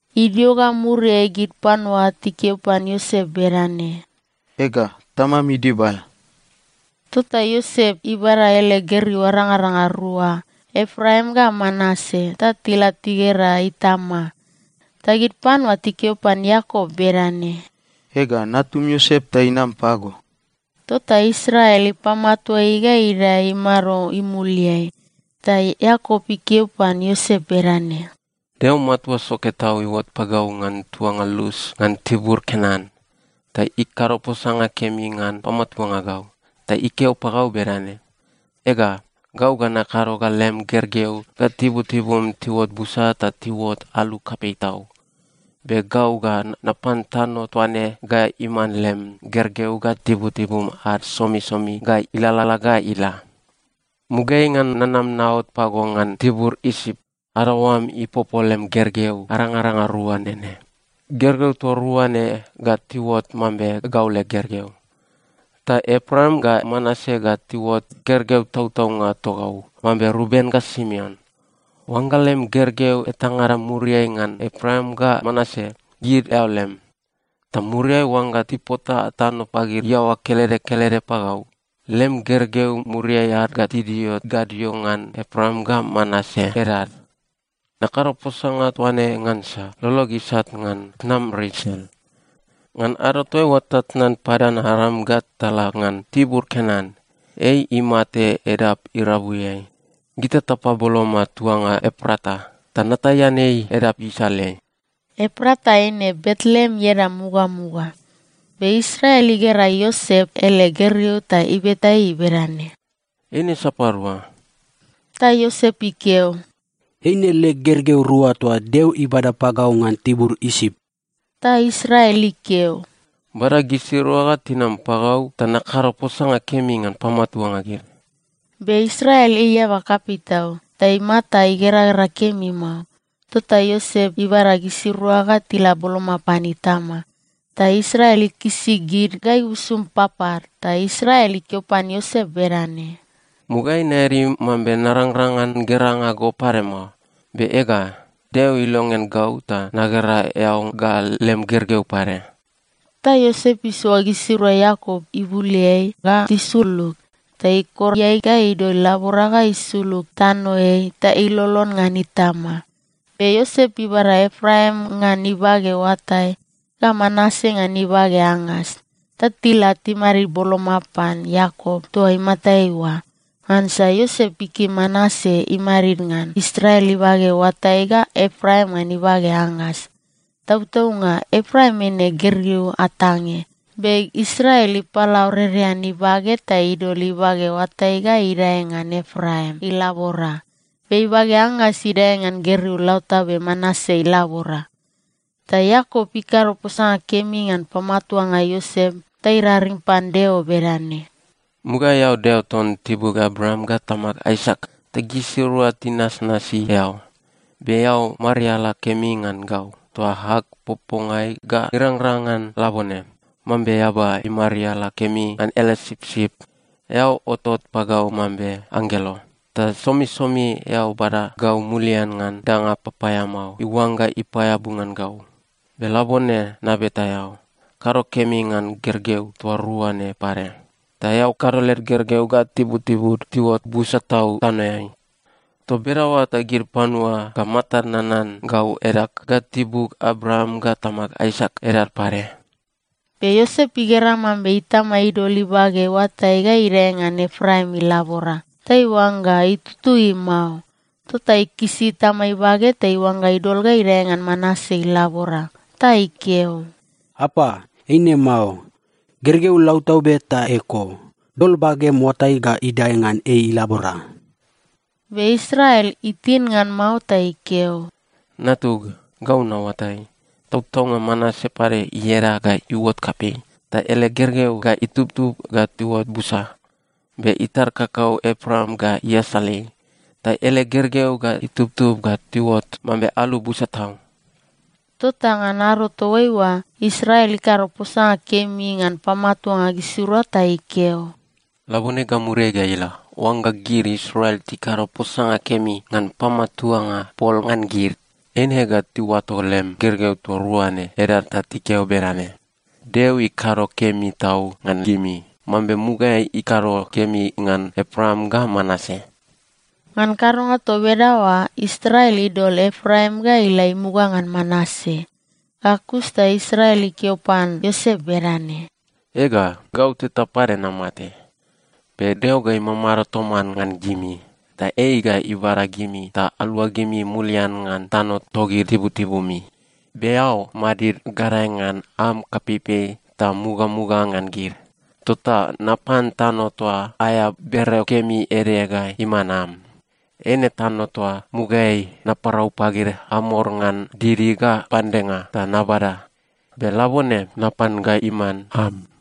Idio ga muriai gid panua tikeo pan Iosep bedane, “Ega, tamam idibal.” Tota Iosep ibada ele gergeu arangaranga rua, Epraim ga Manase, ta tila tigera itama. Ta gid panua tikeo pan Iakop bedane, “Ega, natum Iosep ta inam pago.” Tota Israel ipamatua ei ga idae imado imuliai. Ta Iakop ikeo pan Iosep bedane, “Deo Matua Soke Tau iuot pagau ngan tuanga Lus ngan tibur Kenan. Ta ikado posanga kemi ngan pamatuanga gau ta ikeo pagau bedane, ‘Ega, gau ga nakado ga lem gergeu ga tibutibum tiuot busa ta tiuot alu kapei tau. Be gau ga napan tano toa ne ga iman lem gergeu ga tibutibum ad somisomi ga ilalala ga ila.’ “Mugaeai ngan nanam naot pago ngan tibur Isip, adaoam ipopo lem gergeu arangaranga rua nene. Gergeu toa rua ne ga tiuot mambe gau leg gergeu. Ta Epraim ga Manase ga tiuot gergeu tautaunga togau, mambe Ruben ga Simeon. Oangga lem gergeu etangada muriai ngan Epraim ga Manase, gid eao lem. Ta muriai oangga tipota tano pagid iaoa kelede kelede pagau, lem gergeu muriai ad ga tidio gadio ngan Epraim ga Manase edad. Nakado posanga toa ne ngansa lolog isat ngan tnam Resel. Ngan ado toaiua tatnan Padan-Aram ga tala ngan tibur Kenan, ei imate edap irabuiai. Gita tapaboloma tuanga Eprata, ta nataian ei edap isaleai.” (Eprata eine Betleem ieda mugamuga.) Be Israel igera Iosep ele gergeu ta ibeta ei bedane, “Eine sapadua?” Ta Iosep ikeo, “Eine leg gergeu rua toa Deo ibada pagau ngan tibur Isip.” Ta Israel ikeo, “Bada gisirua ga tinam pagau ta nakado posanga kemi ngan pamatuanga gid.” Be Israel ei eaba kapei tau ta imata igeragera kemi mao. Tota Iosep ibada gisirua ga tila boloma pan itama, ta Israel ikisi gid ga ibusum papad. Ta Israel ikeo pan Iosep bedane, “Mugaeai naeadi mambe narangrang ngan geranga go pade mao. Be ega, Deo ilongean gau ta nagera eao ga lem gergeu pade.” Ta Iosep isoa gisirua Iakop ibuleai ga tisulug, ta ikor iae ga idol ilabora ga isulug tanoeai ta ilolon ngan itama. Be Iosep ibada Epraim ngan ibage oatai ga Manase ngan ibage angas ta tila timadid boloma pan Iakop toa imatai oa, ngansa Iosep ikim Manase imadid ngan Israel ibage oatai ga Epraim ngan ibage angas. Tautaunga Epraim eine gergeu atange, be Israel ipalaurerean ibage ta idol ibage oatai ga idae ngan Epraim ilabora, be ibage angas idae ngan gergeu lautabe Manase ilabora. Ta Iakop ikado posanga kemi ngan pamatuanga Iosep ta iraring pan Deo bedane, “Mugaeai eao Deo ton tibug Abraam ga tamag Aisak, ta gisirua tinasnasi eao. Be eao mariala kemi ngan gau toa ag popongai ga irangrang ngan labone, mambe eaba imariala kemi ngan ele sipsip. Eao otot pagau mambe Anggelo, ta somisomi eao bada gau mulian ngan danga papaeamao iuangga ipaeabu ngan gau. Be labone nabeta eao, kado kemi ngan gergeu toa rua ne pade. Ta eao kado led gergeu ga tibutibud tiuot busa tau tanoeai. Toa bedaoa ta gid panua ga matad nanan gau edag ga tibug Abraam ga tamag Aisak edad pade.” Be Iosep igera mambe itama idol ibage oatai ga idae ngan Epraim ilabora, ta iuangga itutui mao, tota ikisi itama ibage ta iuangga idol ga idae ngan Manase ilabora. Ta ikeo, “Apa, eine mao. Gergeu lautabe ta eko. Dol bagem oatai ga idae ngan ei ilabora.” Be Israel itin ngan mao ta ikeo, “Natug, gau naoatai. Tautaunga Manase pade ieda ga iuot kapei, ta ele gergeu ga itubtub ga tiuot busa, be itar kakau Epraim ga iasal ei, ta ele gergeu ga itubtub ga tiuot mambe alu busa tau.” Tota ngan ado toaiua, Israel ikado posanga kemi ngan pamatuanga gisirua ta ikeo, “Labone ga muriai ga ila, oangga gid Israel tikado posanga kemi ngan pamatuanga pol ngan gid, eine ga tiuato lem gergeu toa rua ne edad ta tikeo bedane, ‘Deo ikado kemi tau ngan gimi, mambe mugaeai ikado kemi ngan Epraim ga Manase.’” Ngan kadonga toa bedaoa Israel idol Epraim ga ila imuga ngan Manase. Ga kus ta Israel ikeo pan Iosep bedane, “Ega, gau teta pade namate. Be Deo ga imamado toman ngan gimi, ta ei ga ibada gimi ta aluagimi mulian ngan tano togid tibutibumi. Be eao madid gadae ngan am kapeipei ta mugamuga ngan gid. Tota napan tano toa aea bereo kemi ede ga iman am. Eine tano toa mugaeai naparau pagid Amor ngan didi ga pandenga ta nabada. Be labone napan ga iman am.”